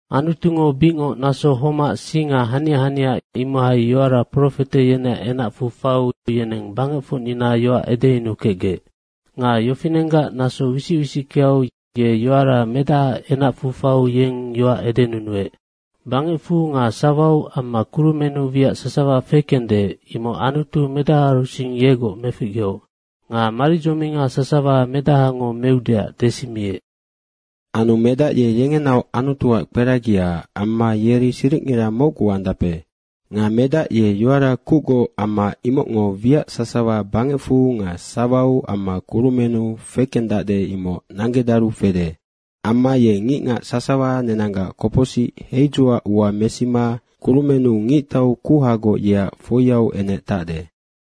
Anutungo bicngoc naso homac singa hania hania imohai yoara profete yeneac enacfu faiu, yeneng bangecfocnina yoac edeyunukecgec. Nga yofinenggac naso wisic wisickeau ye yoara Medahaac enacfu faiu yeng yoac edenunuec. Bangecfu nga sawau amma kurumennu wiac sasawa fekende, imoc Anutu medahaarusing yegoc meficgeoc nga maridzominga sasawa medahango meudeac desimiec. Anu Medac ye yengenaoc Anutuac kperagia amma yeri siricngira mocgu andape. Nga Medac ye yoara kucgoc amma imocngo wiac sasawa bangecfu nga sawau amma kurumennu fekendacde, imoc nanggedaru fede. Amma ye ngicngac sasawa nenanggac kopocsic heidzuac ua mesima kurumennu Ngictau kuhagoc yeac foiau enec tacde.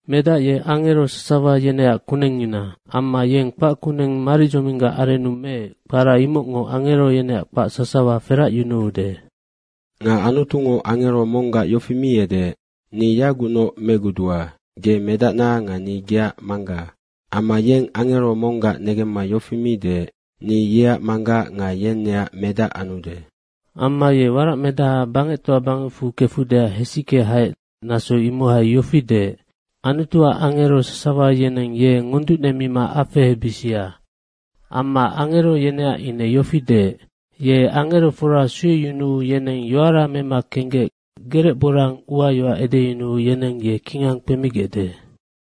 Medac ye angero sasawa yeneac kunengngina. Amma yeng kpac kuneng maridzominggac arennu meec, kpara imocngo angero yeneac kpac sasawa feracyunuude. Nga Anutungo angero monggac yofi mi edeec, “Ni yagucnoc megudua. Ge medacna nga ni geac Mangga.” Amma yeng angero monggac negemma yofi mi deec, “Ni yeac Manggac nga yeng neac Medac anude.” Amma ye waracmedaha bangectoa bangecfu kefudeac hesicke haec, naso imohai yofi deec, “Anutuac angero sasawa yeneng ye ngonducnemima afehebisia.” Amma angero yeneac ine yofi deec, “Ye angerofora sueyunuu yeneng yoara mema kenggec gerecborang uayoac edeyunuu yeneng ye kingang kpemigecde.”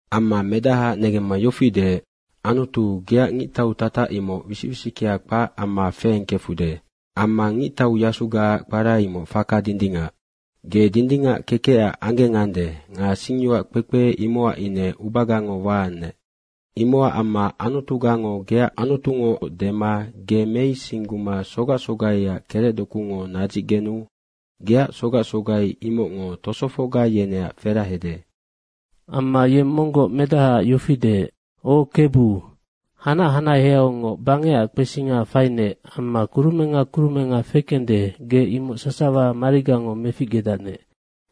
Amma Medahaac negemma yofi deec, “Anutu, geac ngictau tatac imoc wisic wisickea kpac amma feengkefude. Amma ngictau yasugaac kpara imoc faka dindingac. Ge dindingac kekecac anggengande nga singyoac kpekpe, imocac ine ubagango waannec. Imocac amma Anutugango, geac Anutungoc dema ge meisingguma sogac sogaiac kerecdokungo nadzicgenu geac sogac sogai imocngo tosofocga yeneac ferahede.” Amma yeng monggoc Medahaac yofi deec, “O Kebu, hanac hanaheaungoc bangecac kpesinga fainec amma kurumenga kurumenga fekende, ge imoc sasawa marigango meficgedacnec.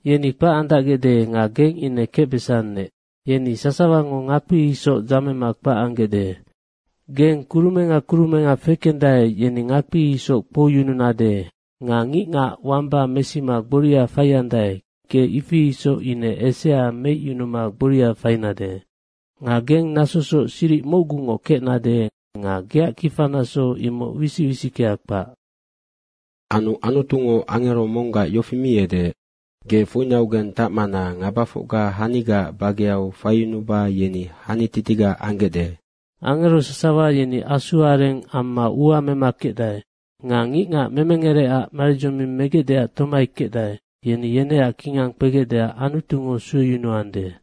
Yeni kpac andacgecde nga geng ine kecbesannec. Yeni sasawango ngakpi isoc dzamema kpac anggecde. Geng kurumenga kurumenga fekendae, yeni ngakpi isoc kpouyununade nga ngicngac wamba mesima gboria faiandae, ge ifi isoc ine esea meicyunuma gboria fainade. Nga geng nasosoc siric mocgungoc kecnade nga geac kifanaso imoc wisic wisickea kpac.” Anu Anutungo angero monggac yofi mi edeec, “Ge foinaugeng tacmana ngabafocga hanigaac bageau faiyunuba yeni hanititiga anggecde.” Angero sasawa yeni asuareng amma ua mema kecdae nga ngicngac memengereac maridzoming megecdeac tomai kecdae yeni yeneac kingang kpegecdeac Anutungo sueyunuande.